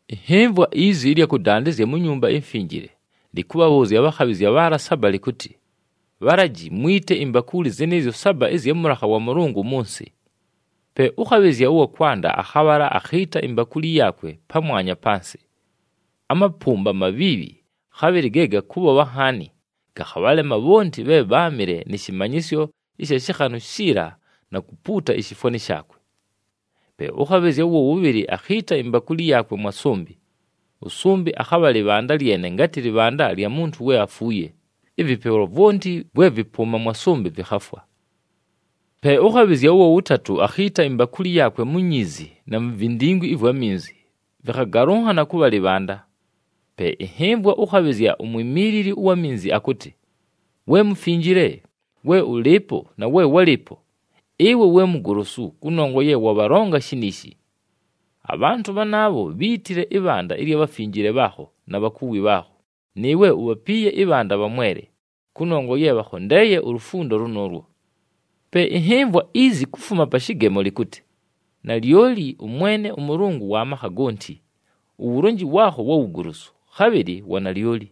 Ɨnhɨmvwa izi ɨlya kʉdandɨzya mu Nyumba iMfinjile, lɨkʉbhabhʉʉzya abhakhabhɨzya bhaala saba lɨkʉtɨ, “Bhalaji, mwite imbakuuli zɨnɨɨzyo saba ɨzya mʉlakha wa Mʉlʉngʉ mʉ nsɨ.” Pe ʉkhabhɨzya ʉwa kwanda akhabhala akhiita imbakuuli yaakwe pamwanya pa nsɨ. Amapʉmba amabhiibhi, khabhɨlɨ ge gakʉbhobha nhaani, gakhabhalema bhonti bhe bháamɨle nɨ shɨmanyɨsyo ɨsha shɨkhanʉ shiila na kupuuta ishifwani shaakwe. Pe ʉkhabhɨzya ʉwa wʉbhɨlɨ akhiita imbakuuli yaakwe mwa sʉmbɨ. Ʉsʉmbɨ akhabha lɨbhanda lyene ngatɨ lɨbhanda lya muntu we afuuye, ɨvɨpelwa vwonti vwe vɨpʉʉma mwa sʉmbɨ vɨkhafwa. Pe ʉkhabhɨzya ʉwa wʉtatʉ akhiita imbakuuli yaakwe mu nyiizi na mu vindingwi ɨvwa minzi, vɨkhagalʉnhana kʉbha lɨbhanda. Pe ɨnhɨmvwa ʉkhabhɨzya umwimiilili ʉwa minzi akʉtɨ, “We Mufinjile, we ʉlɨɨpo na we wálɨɨpo! Ɨwe we mugolosu, kʉnongwa ye wabhalonga shiniishi. Abhantʉ bhanaabho bhíitile ɨbhanda ɨlya bhafinjile bhaakho na bhakuwi bhaakho, nɨɨwe ubhapiiye ɨbhanda bhamwele, kʉnongwa ye bhakhondeeye ulufundo lʉnʉʉlwo.” Pe ɨnhɨmvwa izi kufuma pa shɨgemo lɨkʉtɨ, “Nalyoli ʉMwene ʉMʉlʉngʉ wa makha gonti! Uwulonji waakho wa wugolosu, khabhɨlɨ wa nalyoli!”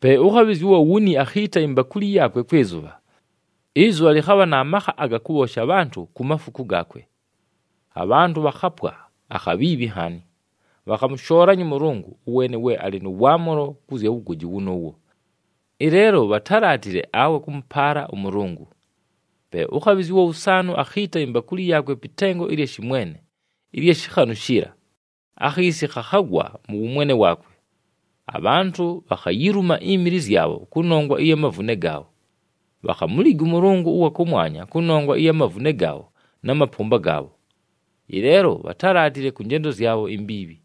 Pe ʉkhabhɨzya ʉwa wuni akhiita imbakuuli yaakwe kwɨ zʉbha. Ɨzʉbha lɨkhabha na makha aga kʉbhoosha abhantʉ ku mafuku gaakwe. Abhantʉ bhakhapwa akhabhiibhi nhaani. Bhakhamʉshoolanya ʉMʉlʉngʉ, ʉweene we alɨ nʉ waamʉlo kʉ zya wugoji wʉnʉʉwo. Ɨleelo bhatálaatile awe kʉmʉpaala ʉMʉlʉngʉ. Pe ʉkhabhɨzya ʉwa wʉsaanʉ akhiita imbakuuli yaakwe pɨ tengo ɨlya shɨmwene ɨlya shɨkhanʉ shiila, akhiisi khakhagwa mʉ wʉmwene waakwe. Abhantʉ bhakhayiluma imili zyabho kʉnongwa ɨya mavune gaabho. Bhakhamuliga ʉMʉlʉngʉ ʉwa kʉmwanya kʉnongwa ɨya mavune gaabho na mapʉmba gaabho. Ɨleelo bhatálaatile kʉ njendo zyabho imbiibhi.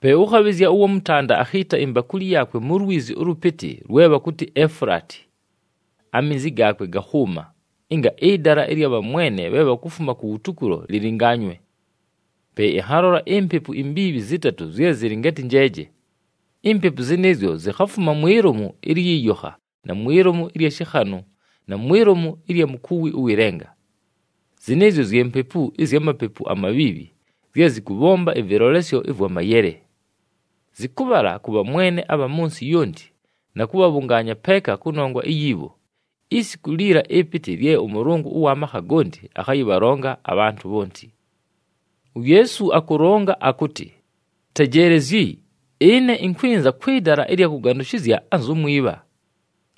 Pe ʉkhabhɨzya ʉwa mʉtanda akhiita imbakuuli yaakwe mu lwizi ʉlʉpɨtɨ lwe bhakʉtɨ Efulaati. Aminzi gaakwe gakhʉʉma, ɨnga ɨdala ɨlya bhamwene bhe bhakufuma kuwutukulo lɨlɨnganywe. Pe ɨnhalola impepu imbiibhi zɨtatʉ zye zɨlɨ ngatɨ njeeje. Impepu zɨnɨɨzyo zikhafuma mwi lomu ɨlyɨ yokha na mwi lomu ɨlya shɨkhanʉ na mwi lomu ɨlya mukuwi ʉwɨ lenga. Zɨnɨɨzyo zye mpepu ɨzya mapepu amabhiibhi zye zɨkʉbhomba ɨvɨlolesyo ɨvwa mayele. Zɨkʉbhala kʉ bhamwene abha mʉ nsɨ yonti na kʉbhabhʉngaanya peeka kʉnongwa iyi bho, isiku liila ɨpɨtɨ lye ʉMʉlʉngʉ ʉwa makha gonti akhayɨbhalonga abhantʉ bhonti. UYeesu akʉlonga akʉtɨ, “Tejeelezyi! Ɨne ɨnkwɨnza kwɨ dala ɨlya kʉgandʉshɨzya anzu mwibha!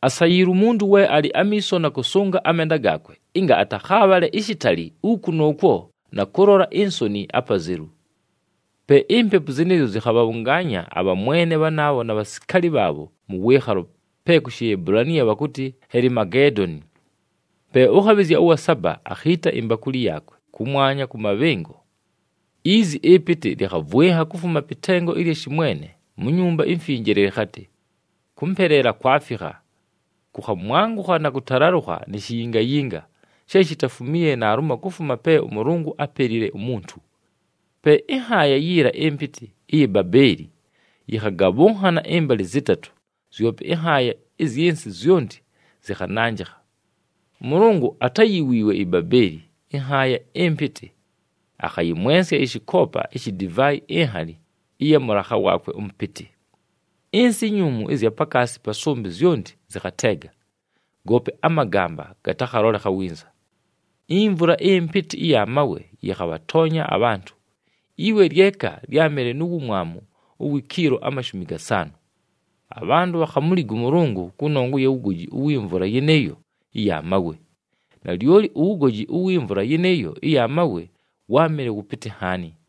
Asayiilwe umuntu we alɨ amiiso na kʉsʉnga amenda gaakwe ɨnga atakhaabhale ishitali uku nʉʉkwo na kʉlola insoni apazelu.” Pe impepu zɨnɨɨzyo zɨkhabhabhʉngaanya abhamwene bhanaabho na bhasikaali bhaabho mʉ wɨɨkhalo, pe ku Shiebulaniya bhakʉtɨ Helimageedoni. Pe ʉkhabhɨzya ʉwa saba akhiita imbakuuli yaakwe kʉmwanya kʉ mabhɨngo. Izi ɨpɨtɨ lɨkhavwɨnha kufuma pɨ tengo ɨlya shɨmwene, mu Nyumba iMfinjile, lɨkhatɨ, “Kʉmpeleela kwafikha!” Kʉkhamwangʉkha na kʉtalalʉkha ni shiyingayinga, she shitafumiiye naalumo kufuma pe ʉMʉlʉngʉ ápelile umuntu. Pe ɨnhaaya yiila ɨmpɨtɨ ɨya Babeeli yɨkhagabhʉnhana ɨmbalɨ zɨtatʉ, zyope ɨnhaaya ɨzyɨ nsɨ zyonti zɨkhananjɨkha. ɄMʉlʉngʉ atáyiwiiwe iBabeeli, ɨnhaaya ɨmpɨtɨ. Akhayɨmwensya ɨshɨkoopa ishi divaayi inhali ɨya mʉlakha waakwe ʉmʉpɨtɨ. Ɨnsɨ inyuumu ɨzya pakaasi pa sʉmbɨ zyonti zɨkhateega, goope amagamba gatakhalolekha winza. Imvula ɨmpɨtɨ ɨya mawe yɨkhabhatoonya abhantʉ, iwe lyeka lyámɨle nu wumwamu uwi kiilo amashumi gasaanʉ. Abhantʉ bhakhamuliga ʉMʉlʉngʉ kʉnongwa ɨya wugoji uwi mvula yɨnɨɨyo ɨya mawe. Nalyoli uwugoji uwi mvula yɨnɨɨyo ɨya mawe wáamɨle wʉpɨtɨ nhaani.